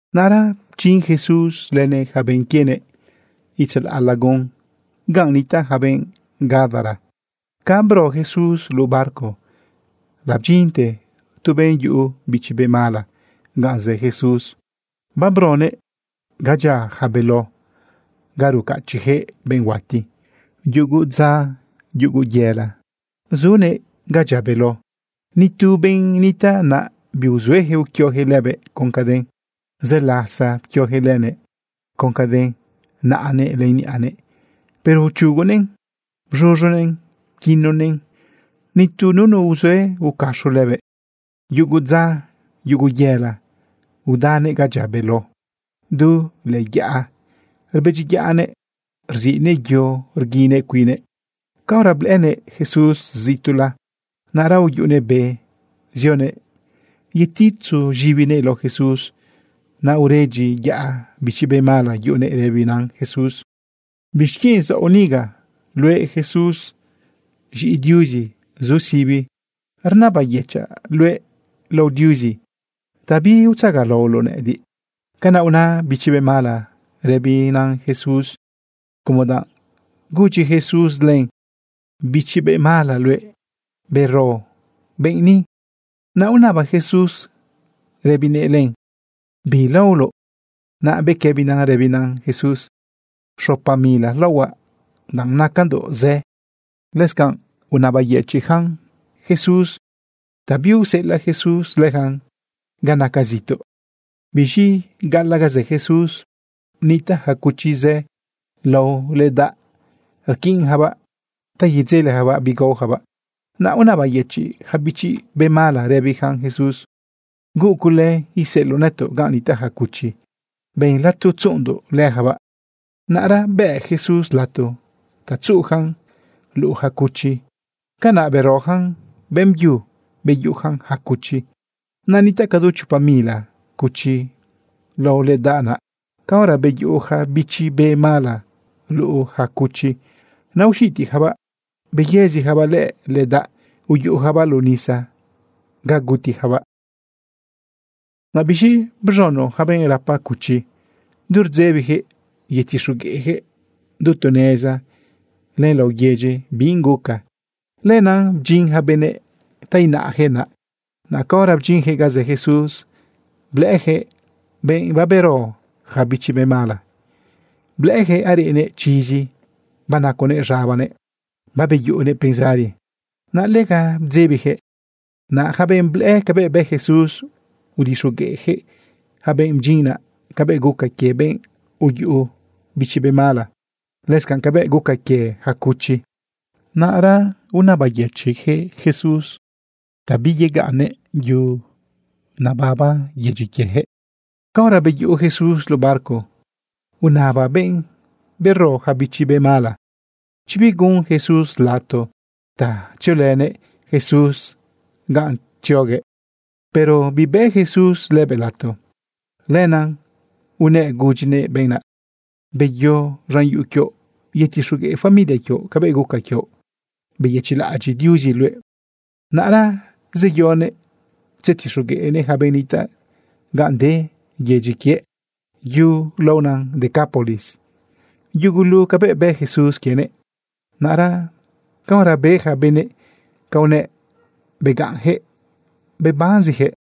Naꞌra bdyin Jesús lënëꞌ yaca benꞌ quienëꞌ itzalaꞌ lagun ganꞌ nitaꞌ yaca benꞌ Gadara. Ca bro Jesús luꞌu barco, labdyinte tu benꞌ yuꞌu bichi be mala ganꞌ zë Jesús. Babronëꞌ ga dyia yaca beló ga rucachiꞌyaquëꞌ benꞌ huati. Yugu dza, yugu yela, zunëꞌ naꞌ ga dyia beló. Ni tu benꞌ nitaꞌ naꞌ biuzueyaquëꞌ uquioyaquëꞌ lëbëꞌ con caden. Zë lasa pquioyaquëꞌ lënëꞌ con caden naꞌanëꞌ len niꞌanëꞌ, pero uchugunëꞌn bz̃uz̃u pquinonëꞌn. Nitu nunu uzue ucaxo lëbëꞌ. Yugu dza, yugu yela, udanëꞌ ga dyia beló du lëꞌë yaꞌa, rbedyiyaꞌnëꞌ rziꞌnëꞌ yo rguinëꞌ cuinnëꞌ. Caora blëꞌënëꞌ Jesús zituꞌla, naꞌra uyuꞌunëꞌ be zionëꞌ yeditzu z̃ibinëꞌ lao Jesús. Naꞌ uredyiyaꞌ bichi be mala yuꞌunëꞌ rëbina Jesús: ―¿Bixquienꞌ zaoꞌ niga? Luëꞌ Jesús, z̃iꞌi Diuzi zu sibi. Rnabayëchaꞌ luëꞌ lao Diuzi ta biutzagalaoloꞌ nëꞌëdiꞌ. Canaꞌ una bichi be mala rëbina Jesús como danꞌ gudyi Jesús len: ―Bichi be mala luëꞌ, bero benꞌ ni. Naꞌ unaba Jesús rëbinëꞌ len: ―¿Bi laoloꞌ? Naꞌ bequëbina rëbina Jesús: ―Xopa mila laohuaꞌ danꞌ nacandoꞌ zë. Lëscanꞌ unabayëchiꞌnëꞌ Jesús ta biuseꞌelaꞌ Jesús leyacan ga naca zituꞌ. Biz̃i gaꞌalaꞌ ganꞌ zë Jesús nitaꞌ yaca cuchi zë lao ledaꞌ. Rquiꞌnyacabaꞌ ta yedzeleyacabaꞌ bi gaoyacabaꞌ. Naꞌ unabayëchiꞌ yaca bichi be mala rëbiyacan Jesús: ―Huuꞌ cule iseꞌeloꞌ nëtoꞌ ganꞌ nitaꞌ yaca cuchi. Ben lato tzuꞌundoꞌ leyacabaꞌ. Naꞌra bëꞌ Jesús lato ta tzuꞌuyacan luꞌu yaca cuchi. Canaꞌ beroyacan beꞌmbyu beyuꞌuyacan yaca cuchi. Naꞌ nitaꞌ cadu chopa mila cuchi lao ledaꞌ naꞌ. Caora beyuꞌu yaca bichi be mala luꞌu yaca cuchi, naꞌ uxitiyacabaꞌ beyëziyacabaꞌ lëꞌë ledaꞌ uyuꞌuyacabaꞌ luꞌu nisa ga gutiyacabaꞌ. Naꞌ biz̃i bz̃uno yaca benꞌ rapa cuchi. Du rdzebiyaquëꞌ yetixogueꞌyaquëꞌ du tu neza len laꞌo yedyi bi guca. Lenaꞌ bdyin yaca benëꞌ ta inaꞌyaquëꞌ naꞌ. Naꞌ caora bdyinyaquëꞌ ga zë Jesús, blëꞌëyaquëꞌ benꞌ babero yaca bichi be mala. Blëꞌëyaquëꞌ areꞌnëꞌ chizi, banaconëꞌ z̃abanëꞌ, babeyuꞌunëꞌ pensari. Naꞌ lega bdzebiyaquëꞌ. Naꞌ yaca benꞌ blëꞌë cabëꞌ bë Jesús, udixogueꞌyaquëꞌ yaca benꞌ bdyin naꞌ cabëꞌ guca quie benꞌ uyuꞌu bichi be mala, lëscanꞌ cabëꞌ guca quie yaca cuchi. Naꞌra unabayëchiꞌyaquëꞌ Jesús ta biyegaꞌnnëꞌ yu nebaba yedyi quieyaquëꞌ. Caora beyuꞌu Jesús luꞌu barco, unaba benꞌ bero yaca bichi be mala chi bigun Jesús lato ta tziolënëꞌ Jesús ganꞌ tzioguëꞌ. Pero bibëꞌ Jesús lëbëꞌ lato. Lenaꞌ unëꞌ gudyinëꞌ benꞌ naꞌ: ―Beyo z̃an yuꞌu quioꞌ yetixogueꞌ familia quioꞌ cabëꞌ guca quioꞌ beyëchiꞌlaꞌadyiꞌ Diuzi luëꞌ. Naꞌra zeyonëꞌ tzetixogueꞌnëꞌ yaca benꞌ nitaꞌ ganꞌ de chi yedyi quie yu laona Decápolis yugulu cabëꞌ bë Jesús quienëꞌ. Naꞌra caora be yaca benëꞌ canꞌ unëꞌ, begaꞌnyaquëꞌ bebanziyaquëꞌ.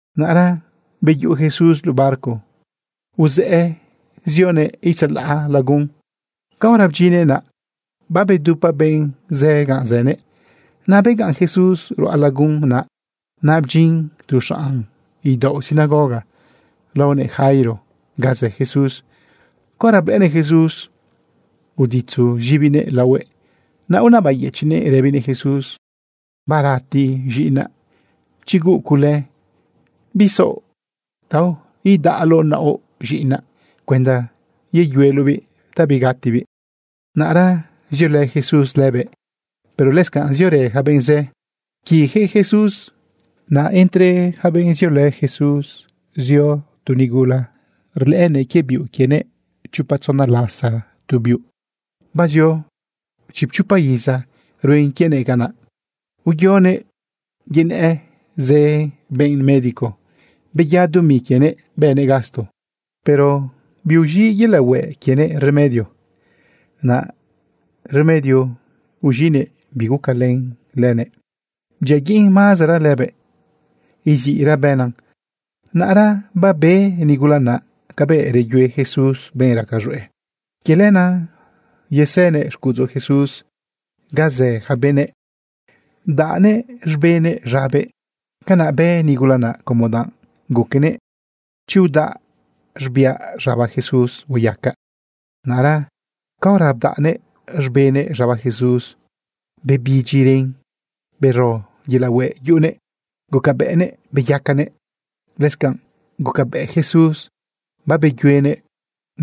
Naꞌra beyuꞌu Jesús luꞌu barco uz̃ëꞌë zionëꞌ itzalaꞌ lagun. Caora bdyinnëꞌ naꞌ, babedupa benꞌ zë ganꞌ zënëꞌ. Naꞌ begaꞌn Jesús ruꞌa lagun naꞌ. Naꞌ bdyin tu xanꞌ idaoꞌ sinagoga laonëꞌ Jairo ganꞌ zë Jesús. Caora blëꞌënëꞌ Jesús, uditzu z̃ibinëꞌ laohuëꞌ. Naꞌ unabayëchiꞌnëꞌ rëbinëꞌ Jesús: ―Barati z̃iꞌinaꞌ. Chi huuꞌ cule, ¿bisaoꞌ ta idedaꞌloꞌ naoꞌ z̃iꞌinaꞌ cuenda yeyueloꞌbiꞌ ta bigatibiꞌ? Naꞌra ziolë Jesús lëbëꞌ, pero lëscanꞌ ziorë yaca benꞌ zë pquiꞌyaquëꞌ Jesús. Naꞌ entre yaca benꞌ ziolë Jesús uzu tu nigula raca quie biuꞌ quienëꞌ chopa tzona lasa tu biuꞌ. Bazio chipchopa iza ruen quienëꞌ canaꞌ. Uyonëꞌ yenëꞌ zë benꞌ médico, beya dumi quienëꞌ bënëꞌ gasto, pero biuz̃iꞌ yelaꞌ hueꞌ quienëꞌ remedio. Naꞌ remedio uz̃iꞌnëꞌ, bigucalën lëbëꞌ, bdyiaguiꞌn mazara lëbëꞌ, iziꞌra bëna. Naꞌra babe nigula naꞌ cabëꞌ reyue Jesús benꞌ raca z̃hueꞌ. Quie lenaꞌ yesënëꞌ xcuꞌudzu Jesús ga zë yaca benëꞌ, bdaꞌnëꞌ z̃benëꞌ z̃abëꞌ. Canaꞌ bë nigula naꞌ como danꞌ guquenëꞌ: “Chi udaꞌ z̃biaꞌ z̃aba Jesús, hueyacaꞌ.” Naꞌra caora bdaꞌnëꞌ z̃benëꞌ z̃aba Jesús, bebidyi ren, bero yelaꞌ hueꞌ yuꞌunëꞌ, gucabëꞌnëꞌ babeyacanëꞌ. Lëscanꞌ gucabëꞌ Jesús babeyuenëꞌ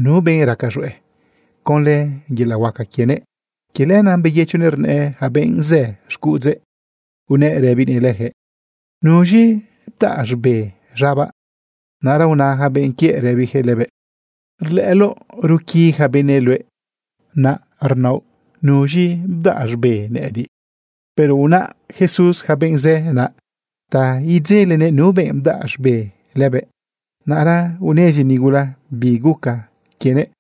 nu benꞌ raca z̃hueꞌ conlë yelaꞌ huaca quienëꞌ. Quie lenaꞌ beyëchoguëꞌ rnëꞌë yaca benꞌ zë xcuꞌudzëꞌ, unëꞌ rëbinëꞌ leyaquëꞌ: ―¿Nuz̃i bdaꞌ z̃be z̃abaꞌ? Naꞌra una yaca benꞌ quiëꞌ rëbiyaquëꞌ lëbëꞌ: ―Rlëꞌëloꞌ ruquiꞌ yaca benëꞌ luëꞌ, naꞌra naoꞌ, “¿Nuz̃i bdaꞌ z̃be nëꞌëdiꞌ?” Pero unaꞌ Jesús yaca benꞌ zë naꞌ ta idzelenëꞌ nu benꞌ bdaꞌ z̃be lëbëꞌ. Naꞌra unezi nigula bi guca quienëꞌ.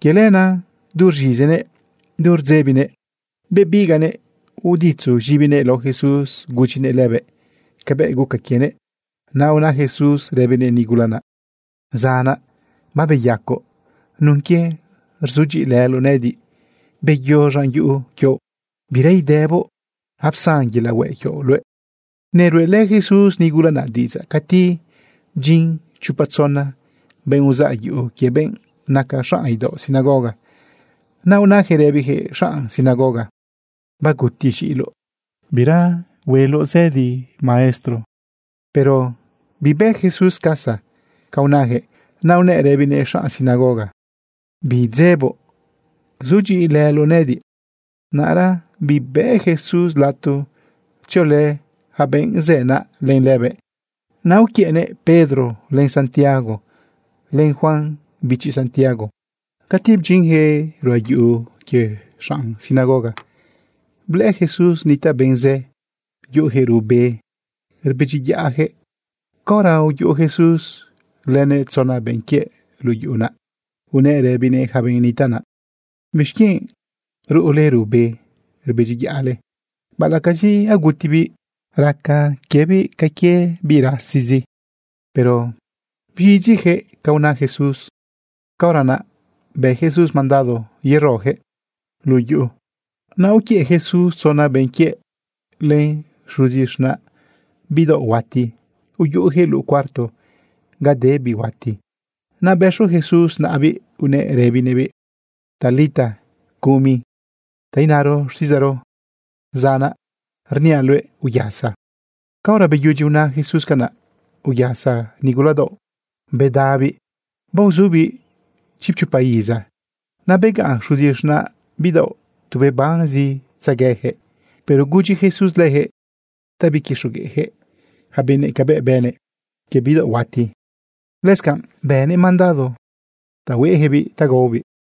Quie lenaꞌ du rz̃izinëꞌ, du rdzebinëꞌ, bebigaꞌnëꞌ uditzu z̃ibinëꞌ lao Jesús, gudyinëꞌ lëbëꞌ cabëꞌ guca quienëꞌ. Naꞌ una Jesús rëbinëꞌ nigula naꞌ: ―Zanaꞌ, babeyacoꞌ nun quie rzudyiꞌilëloꞌ nëꞌëdiꞌ. Beyo z̃an yuꞌu quioꞌ, bira idëboꞌ. Apsan yelaꞌ hueꞌ quioꞌ luëꞌ. Neruꞌelë Jesús nigula naꞌ diꞌidzaꞌ cati bdyin chopa tzona benꞌ uzaꞌ yuꞌu quie benꞌ naca xanꞌ idaoꞌ sinagoga. Naꞌ unayaquëꞌ rëbiyaquëꞌ xanꞌ sinagoga: ―Baguti z̃iꞌiloꞌ. Bira cule hueloꞌ maestro zëdi. Pero bibë Jesús casa ca unayaquëꞌ. Naꞌ unëꞌ rëbinëꞌ xanꞌ sinagoga: ―Bidzeboꞌ. Sudyiꞌilëloꞌ nëꞌëdiꞌ. Naꞌra bibëꞌ Jesús lato tziolë yaca benꞌ zë naꞌ len lëbëꞌ. Naꞌ uquiëꞌnëꞌ Pedro, len Santiago, len Juan bichi Santiago. Cati bdyinyaquëꞌ ruꞌa yuꞌu quie xanꞌ sinagoga, blëꞌë Jesús nitaꞌ benꞌ zë, yuꞌuyaquëꞌ ruꞌbe, rbedyiyaꞌyaquëꞌ. Caora uyuꞌu Jesús lënëꞌ tzona benꞌ quiëꞌ luꞌu yuꞌu naꞌ, unëꞌ rëbinëꞌ yaca benꞌ nitaꞌ naꞌ: ―¿Bixquienꞌ ruꞌule ruꞌbe rbedyiyaꞌle? Baꞌalaꞌcazi agutibiꞌ, raca quiebiꞌ ca quie biꞌ rasizi. Pero bz̃idyiyaquëꞌ ca una Jesús. Caora naꞌ bë Jesús mandado yeroyaquëꞌ luꞌu yuꞌu. Naꞌ uquiëꞌ Jesús tzona benꞌ quiëꞌ len xuzi z̃naꞌ bidaoꞌ huati. Uyuꞌuyaquëꞌ luꞌu cuarto ga de biꞌ huati. Naꞌ bëxu Jesús naꞌabiꞌ unëꞌ rëbinëꞌbiꞌ: ―Talita cumi ―ta inaro xtiꞌidzaꞌro: Zanaꞌ, rniaꞌ luëꞌ, uyasa. Caora beyudyi una Jesús canaꞌ, uyasa nigula daoꞌ bedabiꞌ. Baozubiꞌ chipchopa iza. Naꞌ begaꞌn xuzi z̃naꞌ bidaoꞌ tu bebanzitzegueyaquëꞌ. Pero gudyi Jesús leyaquëꞌ ta biquixogueꞌyaquëꞌ yaca benëꞌ cabëꞌ bënëꞌ quie bidaoꞌ huati. Lëscanꞌ bënëꞌ mandado ta hueꞌyaquëꞌbiꞌ ta gaobiꞌ.